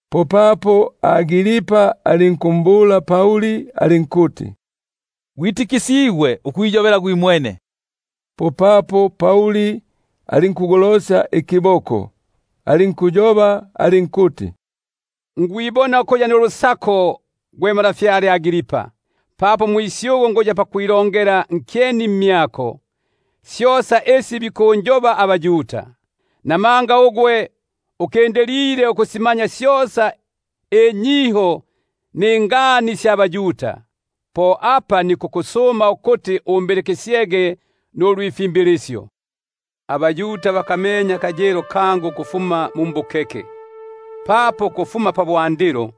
Popapo Agripa alinkumbula Pauli alinkuti: Gwitikisigwe ukwiyobela gwimwene. Popapo Pauli alinku- golosya ikiboko, alinkwilongela alinkuti: Nikwibona ukuya nsangalufu, gwe ntwa Agripa, papo umusyugu nikuya pakwilongela nkyeni mmyako, syosa isi bikundonga abaYuda; namanga likindilile ukwisibisania ninyiho ningani syosa sya baYuda, po apa nikusuma kumyako ukuti umbilikisyege, singakutingaga. Bosa abaYuda bakamenye akayilo kangu ukufuma mu mbukeke, papo ukufuma pabwandilo,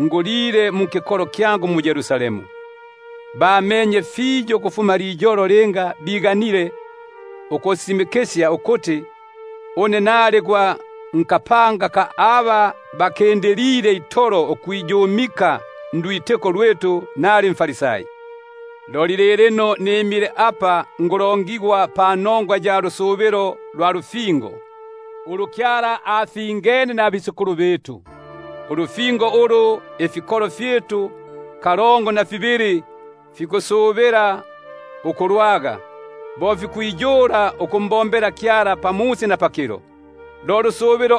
ngulile mu nkikolo kyangu mu-Yerusalemu; bamenye fiyo ukufuma liyolo linga biganile ukusisimikisya ukuti nali gwa nkapanga ka aba bakindilile itolo ukwiyumika, bo mumo luyilile ulwitiko lwitu, nali mFarisai. Loli lilino nimile papapa nikulongigwa panongwa ya lusubilo lwa lufingo, ulu Kyala afingene nabatata; ulu ifikolo fyitu kalongo na fibili fikusubila ukulwaga, bo fikwiyula ukumbombela Kyala pamusi na pakilo; lo lusubilo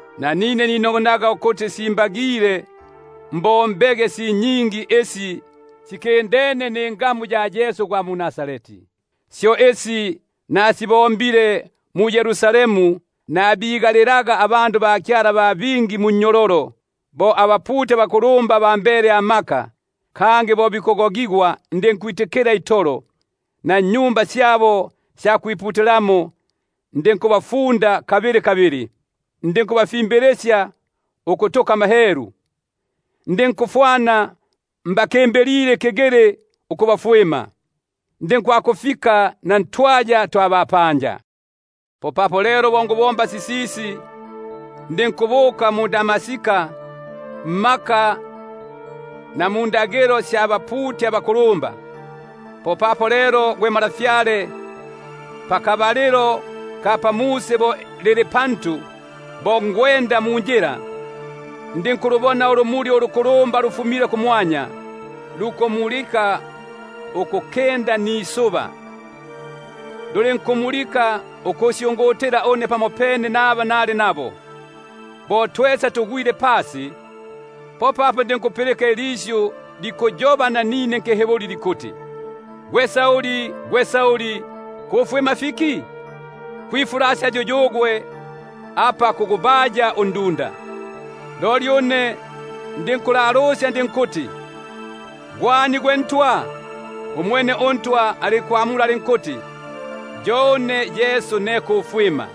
Nanine ninogonaga ukuti fikuti mbombege si nyingi isi sikindene ningamu ya Yesu gwa mu-Nazareti; syo isi nasibombile mu-Yerusalemu, nabigalilaga abikemo ba bingi munnyololo, bo abaputi abakulumba bambele amaka, kangi bo bikugogigwa ndinkwitikila itolo. Na mmaSinagogi gabo ndinkubafunda kabili kabili, ndinkubafimbilisya ukutuka amahelu; ndinkufwana mbakimbilile itolo ikigili ukubafwima, ndinkwakufika na ntwaya twa bapanja. Popapo lelo bo nikubomba sisisi, ndinkubuka mu-Damaska mmaka na mundagilo sya baputi abakulumba. Popapo lelo gwe ntwa, pamusi bo lili pantu, bo ngwenda munjila, ndinkulubona ulumuli lufumile kumwanya, lukumulika ukulikinda nisuba, lulinkumulika ikusyungutila une pamopene naba nali nabo. Bo twesa tugwile pasi, popapo ndinkupilika ilisyu likuyoba nanine nkiHiburi likuti: Gwe Sauli, gwe Sauli, kufwima fiki? Kupalapala ugwe ukugubaya undunda. Loli une ndinkulalusya ndinkuti: Gwe ani gwe Ntwa? Umwene uNtwa alinkuti: Yo une Yesu ne kufwima.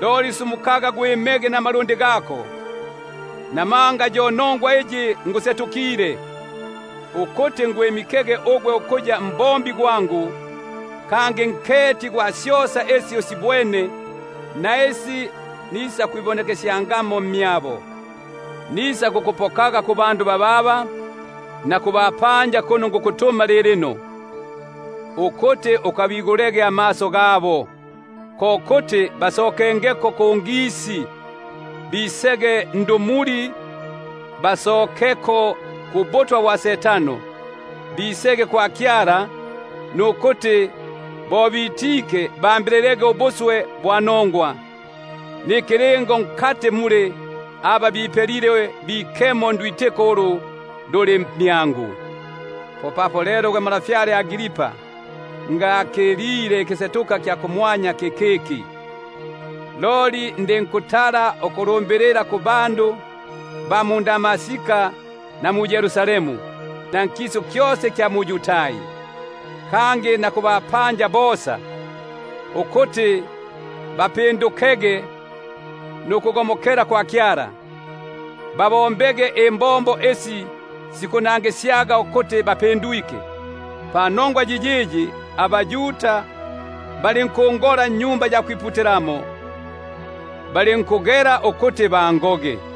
Loli sumukaga gwimege namalundi gako, namanga yo nongwa iyi ngusetukile, ukukwimika ukuya mbombi kangi nketi gwa syosa isi usibwene, na isi nisakwibonekesyangamo mmyako. Nisakukupokaga kubandu bababa, na kubapanja kuno nikukutuma lilino, ukuti ukabigulege amaso, ko kuti bagomokeko kungisi, bisege ndumuli; bagomokeko kumaka ga Setano, bisege kwa Kyala; nukuti bambililege ubuswe bwa nongwa, nikilingo nkati muli aba bipelile bikemo ndwitiko ulu luli mmyangu. Po apa lelo gwe ntwa Agripa, ndinkusita nukukila ikisetuka kya kumwanya kikiki. Loli ndinkutala ukulumbilila ku ba mu-Damaska na mu-Yerusalemu, na nkisu kyosa ikya mu-Yudai, kangi na kubapanja bosa ukuti bapindukege nukugomokela kwa Kyala, babombege imbombo isi sibagisenie nulupinduko. Panongwa yiyiyi, abaYuda balinkungola mwa Tempeli, balinkugela ukuti bangoge.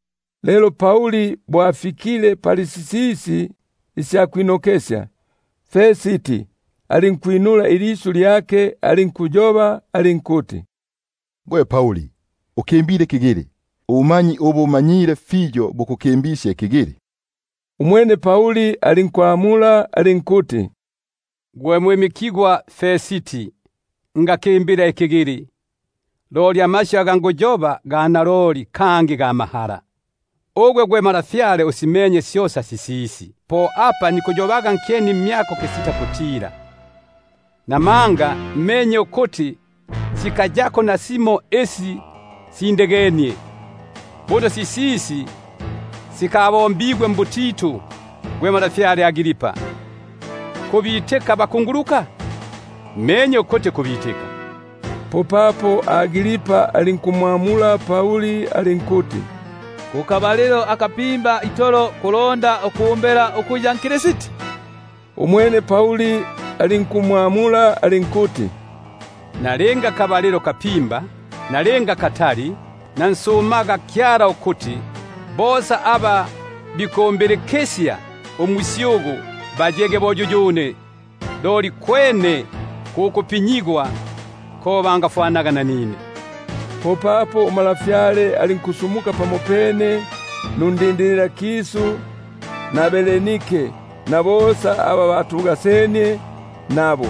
Lelo bo ikwinokesya sisisi, Festi alinkwinula ilisyu alinkuyoba alinkuti: Gwe Pauli, ukimbile ikigili; ubumanyi ubu umanyile fiyo bukukimbisye ikigili. Umwene Pauli alinkuti: Ngakimbila ikigili gwe mwimikigwa Festi; loli amasyu aga nguyoba ga naloli kangi ga mahala. Buno untwa uyu asimenye syosa sisisi, kangi nkuyoba kumyake kisita kutila, namanga menye ukuti sikayako nasimo isi sindegenie; buno sisisi sikali- pelile mbutitu. Bule gwe ntwa Agripa, kubitika abakungu- luka? Mmenye ukuti kubitika. Popapo Agripa alinkumwamula Pauli alinkuti: Nkabalilo kapimba itolo kulonda uku- mbela ukuya nKristi! Umwene Pauli alinkuti: Nalinga kabalilo kapimba, nalinga katali, nansumaga Kyala ukuti, gwemma gwimwene, loli na bosa aba bambilike umusyugu, ukuti bayege bo yuyune; loli kwene ku kupinyigwa ko bangafwanaga nanine. Popapo untwa alinkusumuka pamopene nundindililakisu na Bernike na bosa aba batugasenie nabo;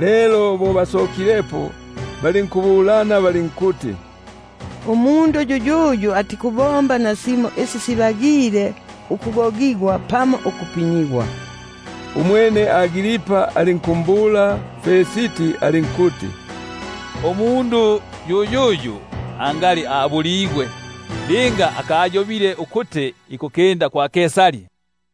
lelo bo bikwabilepo, popapo balinkuyobesania balinkuti: Umundu yuyuyu atiku-bomba nasimo isi simbagile ukugogigwa pamo ukupinyigwa. Umwene Agripa alinkumbula Festi alinkuti: Umundu yuyuyu angali abuligwe, linga akayobile ukuti ikukinda kwa Kaisari.